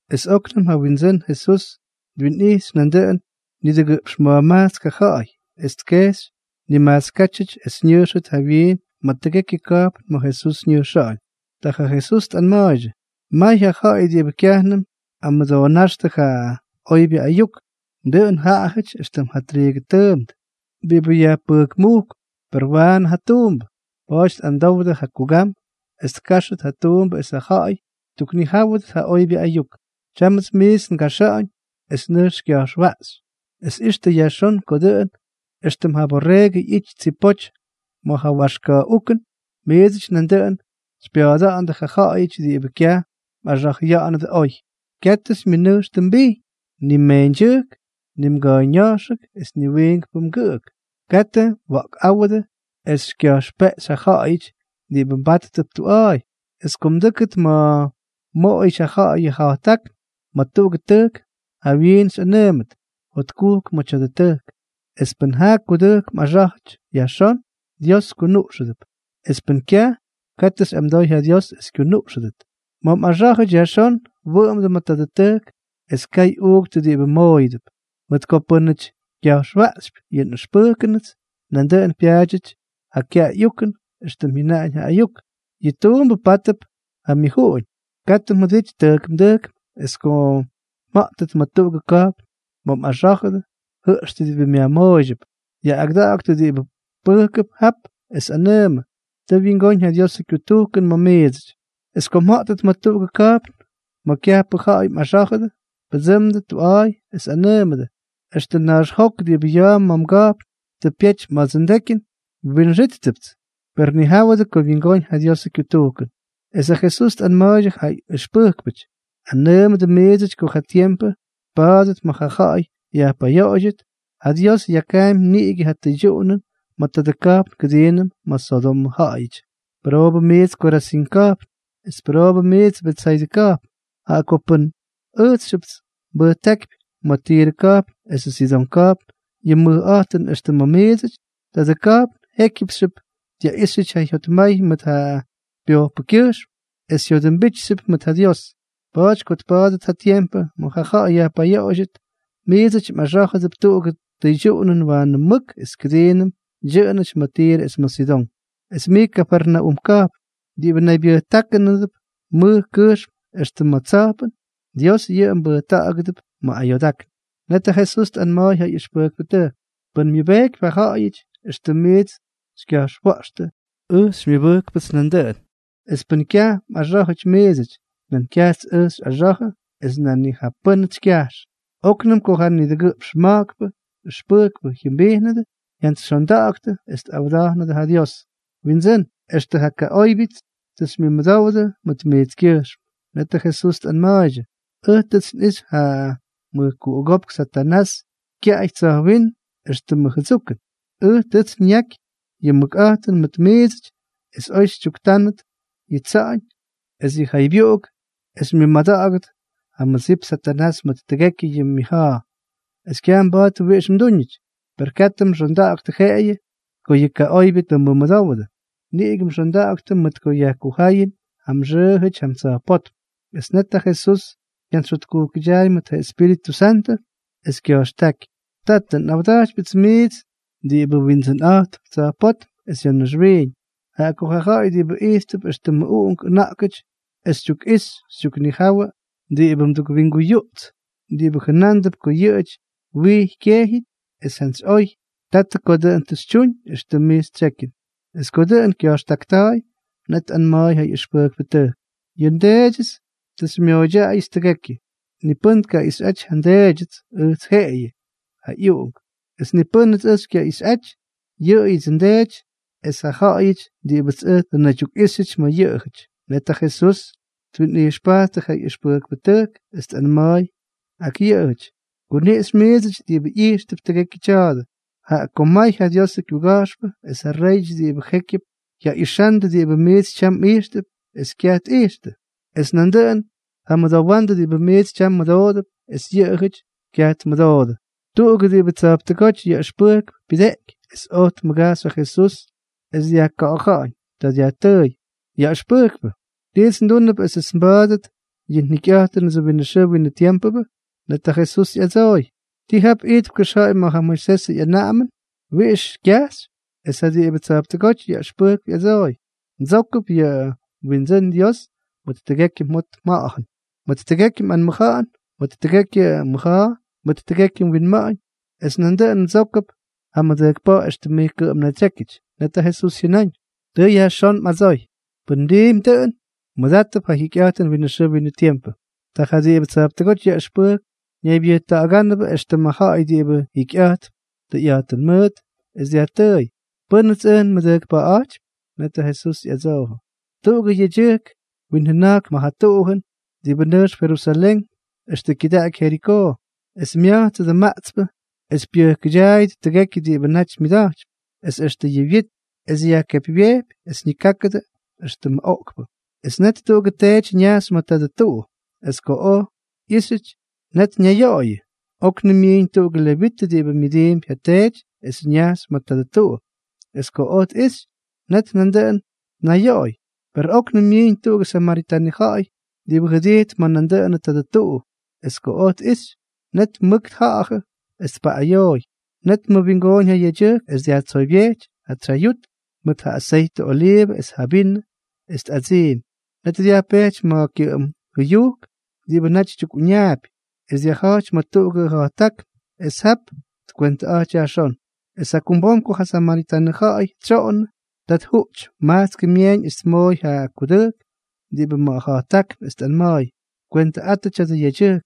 Es óknʉm ja Windsʉ́n Jesús twinꞌijxy nandʉꞌʉn nidʉgʉꞌpx ma̱jmajtsk ja ja̱ꞌa̱y, es tkejxy nimajtskátyʉty es ñʉjxʉt jawyiin ma̱ tʉgekyʉ ka̱jpn ma̱ Jesús ñʉjxa̱ꞌa̱ñ. Ta ja Jesús tꞌanma̱a̱ydyʉ: —May ja ja̱ꞌa̱y diꞌibʉ kyajnʉm tꞌamʉdoonáxtʉ ja oybyʉ ayuk. Dʉꞌʉn jaꞌajʉty éxtʉm ja triigʉ tʉʉmt diꞌibʉ yajpʉjkmujkp, per waanʉ ja tuumbʉ. Pa̱a̱ty amdowdʉ ja Kugam es tkáxʉt ja tuumbʉ esʉ ja̱ꞌa̱y ttuknijáwʉdʉt ja oybyʉ ayuk. ’Tyámʉts miits ngaxa̱ꞌa̱ñ es nʉjx xykya̱jxwaꞌxy. Es ixtʉ yajxón ko dʉꞌʉn éxtʉm ja borreegʉ ꞌyity tsipoty ma̱ ja waxka̱ꞌukʉn, miidsʉty nandʉꞌʉn xypya̱a̱da̱ꞌa̱ndʉ ja ja̱ꞌa̱yʉty diꞌibʉ kyaj mꞌaxa̱jʉya̱ꞌa̱nʉdʉ oy. Katʉ xymyʉnʉjxtʉ mbijñ, ni mmeeñdyʉjk, ni mga̱a̱yña̱jxʉk es ni wiinkpʉ mgʉꞌʉk. Katʉ mwa̱ꞌkꞌáwʉdʉ es xykya̱jxpeꞌxy ja ja̱ꞌa̱yʉty diꞌibʉ mbáttʉp tuꞌa̱a̱y. Es ko mdʉ́kʉt ma̱ mmoꞌoyʉty ja ja̱ꞌa̱y yʉ ja̱jttákn ma̱ tuꞌugʉ tʉjk, jawyiin xyꞌanʉʉmʉt: “Jotkujk ma̱ tya̱dʉ tʉjk.” Es pʉn ja kudʉjk mꞌaxá̱jʉp yajxón, Dios kunuꞌxʉdʉp. Es pʉn kyaj, katʉ xyꞌamdoy ja Dios es kyunuꞌxʉdʉt. Ma̱ mꞌaxá̱jʉty yajxón, wʉꞌʉmdʉ ma̱ tadʉ tʉjk es kay uuktʉ diꞌibʉ mmooyʉdʉp, mʉt ko pʉ́nʉty kya̱jxwaꞌxypy yʉ nꞌʉxpʉjkʉnʉts, nandʉꞌʉn pyaadyʉty ja ka̱ꞌa̱y ukʉn éxtʉm jyʉnaꞌañ ja ayuk: “Yʉ tuumbʉ pátʉp ja myʉjuꞌuñ.” Katʉ mjʉdity tʉjkmdʉjkm. Es ko mja̱ꞌtʉt ma̱ tuꞌugʉ ka̱jpn ma̱ mꞌaxá̱jʉdʉ, jʉꞌxtʉ diꞌibʉ myajmooydyʉp. Yaꞌꞌagʉda̱ꞌa̱ktʉ diꞌibʉ pʉjkʉp jap, es anʉʉmʉ: “Tʉ wyingóñ ja Diosʉ kyutujkʉn ma̱ miidsʉty.” Es ko mja̱ꞌtʉt ma̱ tuꞌugʉ ka̱jpn ma̱ kyajpʉ ja̱ꞌa̱y mꞌaxá̱jʉdʉ, pʉdsʉmdʉ tuꞌa̱a̱y es anʉʉmʉdʉ: “Extʉ naxjok diꞌibʉ ya̱a̱ ma̱ mga̱jpn tʉ pyety ma̱dsʉ ndekyʉn, nwinxítʉpts. Per nijáwʉdʉ ko wyingóñ ja Diosʉ kyutujkʉn.” Es ja Jesús tꞌanma̱a̱ydyʉ ja ꞌyʉxpʉjkpʉty: —Nꞌanʉʉmʉdʉ miidsʉty ko ja tiempʉ tpa̱a̱dʉt ma̱ ja ja̱ꞌa̱y yajpayoꞌoydyʉt, ja Dios yakaampy niꞌigʉ ja tʉydyuꞌunʉn ma̱ tadʉ ka̱jpn kʉdiinʉm ma̱ Sodomʉ ja̱ꞌa̱yʉty. ’Pʉroobʉ mijts Korazín ka̱jpn, es pʉroobʉ mijts Betsaydʉ ka̱jpn, jaꞌa ko pʉn ʉjtsxyʉp nbʉjtákypy ma̱ Tirʉ ka̱jpn esʉ Sidón ka̱jpn yʉ mʉjꞌa̱jtʉn éxtʉm ma̱ miidsʉty, tadʉ ka̱jpn jékyʉpxyʉp dyaꞌíxyʉty ja jyotmay mʉt ja pyojpʉkyʉjxm es jyodʉmbijtxyʉp mʉt ja Dios. Pa̱a̱ty ko tpa̱a̱dʉt ja tiempʉ ma̱ ja ja̱ꞌa̱y yajpayoꞌoydyʉt, miidsʉty mꞌaxá̱jʉp tuꞌugʉ tʉydyuꞌunʉn waanʉ mʉk es kʉdiinʉm dyʉꞌʉnʉty ma̱ Tirʉ es ma̱ Sidón. Es mij Kafarnaúm ka̱jpn, diꞌibʉ naybyʉjta̱ꞌa̱gánʉp mʉj kʉjxm extʉ ma̱ tsa̱jpʉn, Dios yʉꞌʉ mbʉjta̱ꞌa̱gʉdʉp ma̱ ayoodákn. Net ja Jesús tꞌanma̱a̱y ja ꞌyʉxpʉjkpʉtʉjk: —Pʉn myʉbejkypy ja ja̱ꞌa̱yʉty éxtʉm miits xykya̱jxwa̱ꞌxtʉ, ʉj xymyʉbʉjkpʉts nandʉꞌʉn. Es pʉn kyaj mꞌaxá̱jʉty miidsʉty, nan kyajts ʉj xyꞌaxa̱jʉ es nan ni jaꞌa pʉ́nʉts xykyajx. Oknʉm ko ja nidʉgʉꞌpx ma̱jkpʉ ʉxpʉjkpʉ jyʉmbijnʉdʉ, jyantsyxyondaktʉ es tꞌawa̱ꞌa̱nʉdʉ ja Jesús: —Windsʉ́n, extʉ ja kaꞌóybyʉty tʉ xymyʉmʉdówdʉts mʉt mijtskyʉjxm. Netʉ Jesús tꞌanma̱a̱ydyʉ: —Ʉj tʉts nꞌixy ja mʉjkuꞌugópk Satanás kyaꞌay tsa̱jwínm éxtʉmʉ jʉdsukʉn. Ʉj tʉts nyaky yʉ mʉkꞌa̱jtʉn mʉt miidsʉty es oy xytyuktaanʉt yʉ tsa̱ꞌa̱ñ es yʉ jaybyuꞌuk es xymyʉmada̱ꞌa̱gʉt ja mʉdsip Satanás mʉt tʉgekyʉ ja myʉja̱a̱, es kyaj mba̱a̱t wiꞌix mdúñʉty. Per katʉ mxonda̱ꞌa̱ktʉ jeꞌeyʉ ko yʉ kaꞌoybyʉ tʉ mmʉmʉdówʉdʉ, niꞌigʉ xonda̱ꞌa̱ktʉ mʉt ko yajkuja̱ꞌa̱yʉn ja mxʉʉjʉty jam tsa̱jpótm. Es netyʉ ja Jesús jyantsyjyotkujkʉdyaay mʉt ja Espíritʉ Santʉ es kya̱jxtáky: —Tatʉ, nꞌawda̱jtypyʉts mijts diꞌibʉ Windsʉnꞌa̱jtp tsa̱jpótm es ya̱ naxwiiñ, jaꞌa ko ja ja̱ꞌa̱y diꞌibʉ ijttʉp éxtʉmʉ uꞌunk ʉna̱ꞌkʉty tʉ xytyukꞌixy xytyuknijawʉ diꞌibʉ mdukwinguyuꞌts diꞌibʉ jʉnándʉp ko yʉꞌʉjʉty wijy kejyʉty. Es jantsy oy, Tatʉ, ko dʉꞌʉn tʉ xytyuñ éxtʉm mij xytsyekyʉn. Es ko dʉꞌʉn kya̱jxtakta̱a̱y, net tꞌanma̱a̱y ja ꞌyʉxpʉjkpʉtʉjk: —Yʉ nDeedyʉts tʉ xymyooydyaꞌayʉts tʉgekyʉ. Ni pʉ́n tkaꞌixyꞌaty ja nDeedyʉts, ʉjts jeꞌeyʉ, jaꞌa ꞌyUꞌunk. Es ni pʉ́nʉts ʉj xykyaꞌixyꞌaty, yʉꞌʉyʉdsʉ nDeety es ja ja̱ꞌa̱yʉty diꞌibʉts ʉj tʉ nnaydyukꞌíxyʉty ma̱ yʉꞌʉjʉty. Net ja Jesús twinꞌijxpajttʉ ja ꞌyʉxpʉjkpʉtʉjk es tꞌanma̱a̱y ak yʉꞌʉjʉty: —Kuniꞌxy miidsʉty diꞌibʉ ijxtʉp tʉgekyʉ tya̱a̱dʉ. Jaꞌa ko may ja Diosʉ kyuga̱jxpʉ es ja réyʉty diꞌibʉ jékyʉp, jyaꞌixandʉ diꞌibʉ miits tyam mꞌijxtʉp, es kyaj tꞌijxtʉ, es nandʉꞌʉn tjamʉdowandʉ diꞌibʉ miits tyam mmʉdoodʉp, es yʉꞌʉjʉty kyaj tmʉdoodʉ. Tuꞌugʉ diꞌibʉ tsa̱jptʉgóty yaꞌʉxpʉjkp pyʉdeꞌky es oj tmʉgajxy ja Jesús es dyajka̱ꞌa̱ja̱ꞌa̱ñ. Ta dyajtʉʉy: —Yaꞌʉxpʉjkpʉ, ¿tits ndúnʉp esʉts nba̱a̱dʉt ja njikyꞌa̱jtʉnʉts winʉ xʉʉ winʉ tiempʉ? Net ja Jesús ꞌyadsooy: —¿Ti jap ijtp kʉxja̱ꞌa̱y ma̱ ja Moisesʉ ꞌyanaꞌamʉn? ¿Wiꞌix xykyajxy? Es ja diꞌibʉ tsa̱jptʉgóty yaꞌʉxpʉjkp ꞌyadsooy: —Mdsókʉp yʉ mWindsʉ́n Dios mʉt tʉgekyʉ mjot mja̱ꞌa̱jʉn, mʉt tʉgekyʉ mꞌanmʉja̱ꞌa̱n, mʉt tʉgekyʉ mmʉja̱a̱, mʉt tʉgekyʉ mwinma̱ꞌa̱ñ, es nandʉꞌʉn mdsókʉp ja mmʉdʉjkpa̱ꞌa̱ éxtʉm mij kʉꞌʉm mnaydsyékyʉty. Net ja Jesús jyʉnáñ: —Tʉ yajxón mꞌadsoy. Pʉn mdiimpy dʉꞌʉn, mmʉdátʉp ja jikyꞌa̱jtʉn winʉ xʉʉ winʉ tiempʉ. Ta ja diꞌibʉ tsa̱jptʉgóty yaꞌʉxpʉjkp naypyʉjta̱ꞌa̱gánʉp éxtʉm ja̱ꞌa̱y diꞌibʉ jikyꞌa̱jtp tʉyꞌa̱jtʉn mʉʉt, es dyajtʉʉy: —¿Pʉ́nʉts ʉj nmʉdʉjkpa̱ꞌa̱ꞌa̱jtypy? Net ja Jesús ꞌyadsoojʉ: —Tuꞌugʉ yedyʉjk winjʉna̱jkp ma̱ ja tuꞌujʉn diꞌibʉ nʉjxp Jerusalén extʉ kyʉdaꞌaky Jerikoo. Es mya̱jtsʉdʉ maꞌtspʉ es pyʉjkʉdyaayʉdʉ tʉgekyʉ diꞌibʉ naty myʉda̱jtypy, es extʉ yʉ wyit, es yajkepywyejpy, es ñikákʉdʉ éxtʉmʉ oꞌkpʉ. Es net tuꞌugʉ teety ñajxy ma̱ tadʉ tuꞌu. Es ko oj ꞌyíxyʉty, net ñayoꞌoyʉ. Oknʉm myiiñ tuꞌugʉ levitʉ diꞌibʉ myʉdiimpy ja teety es ñajxy ma̱ tadʉ tuꞌu, es ko oj tꞌixy, net nandʉꞌʉn tnayoꞌoy. Per óknʉm myiiñ tuꞌugʉ samaritanʉ ja̱ꞌa̱y diꞌibʉ jʉdijtp ma̱ nandʉꞌʉnʉ tadʉ tuꞌu. Es ko tꞌijxy, net mʉk tja̱ꞌa̱jʉ es tpaꞌꞌayooy. Net tmʉwingooñ ja yedyʉjk es dyajtsoybyejty ja tsyayut mʉt ja aseytʉ oliivʉ es ja vinʉ, es tꞌadsiimy. Net dyajpejty ma̱ kyʉꞌʉm jʉyujk diꞌibʉ naty tyukꞌuñaapy, es dyajja̱jty ma̱ tuꞌugʉ ja̱jttákn es jap tkwentʉꞌa̱jty yajxón. ’Es jakumbom ko ja samaritanʉ ja̱ꞌa̱y tsyoꞌonnʉ, ta tjuꞌty majtskʉ myeeñ es tmooy ja kudʉjk diꞌibʉ ma̱ ja̱jttákn es tꞌanma̱a̱y: “Kwentʉꞌatʉ tya̱dʉ yedyʉjk,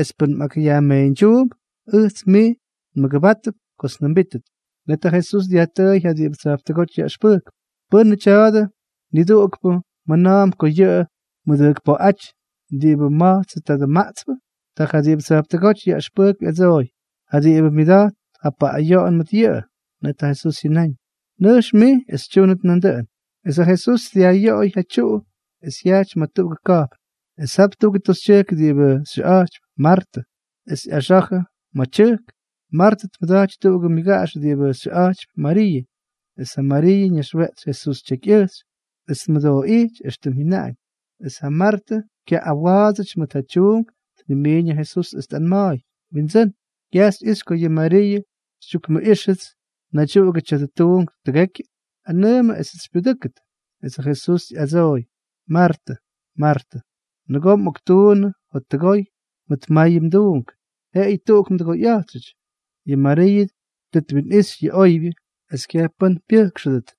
es pʉn mꞌakꞌyajmeeñdyuump, ʉjts mij nmʉgʉbátʉp kots njʉmbítʉt.” Net ja Jesús dyajtʉʉy ja diꞌibʉ tsa̱jptʉgóty yaꞌʉxpʉjkp: —¿Pʉ́nʉ tya̱dʉ nidʉgʉʉkpʉ mjʉna̱a̱mp ko yʉꞌʉ tmʉdʉjkpa̱ꞌa̱jʉty diꞌibʉ ma̱jtsʉ tadʉ maꞌtspʉ? Ta ja diꞌibʉ tsa̱jptʉgóty yaꞌʉxpʉjkp ꞌyadsooy: —Ja diꞌibʉ myʉda̱jt ja paꞌꞌayoꞌon mʉt yʉꞌʉ. Net ja Jesús jyʉnáñ: —Nʉjx mij es xytyúnʉt nandʉꞌʉn. Es ja Jesús dyajꞌyoꞌoy ja tyuꞌu es jyajty ma̱ tuꞌugʉ ka̱jpn. Es jap tuꞌugʉ toxytyʉjk diꞌibʉ xyʉꞌa̱jtypy Martʉ, es ꞌyaxa̱jʉ ma̱ tyʉjk. Martʉ tmʉdaty tuꞌugʉ myʉgaꞌax diꞌibʉ xyʉꞌa̱jtypy Mariiʉ. Es yʉ Mariiʉ ñaxweꞌtsy Jesús tyekyꞌʉjxy es tmʉdooꞌijty éxtʉm jyʉnaꞌañ. Es ja Martʉ kyaꞌꞌawa̱a̱dsʉty mʉt ja tyuunk tnimiiñ ja Jesús es tꞌanma̱a̱y: —Windsʉ́n, ¿kyaj xyꞌixy ko yʉ Mariiʉ xytyukmʉꞌíxʉts naydyuꞌugʉ tya̱dʉ tuunk tʉgekyʉ? Anʉʉmʉ esʉts xypyudʉ́kʉt. Es ja Jesús ꞌyadsooy: —Martʉ, Martʉ, nʉgoo mꞌoktuunnʉ jottʉgoy mʉt mayʉ mduunk. Jeꞌeyʉ tuꞌuk mdʉgoyꞌa̱jtxʉty. Yʉ Mariiʉ tʉ twinꞌixy yʉ oybyʉ, es kyaj pʉ́n pyʉjkxʉdʉt.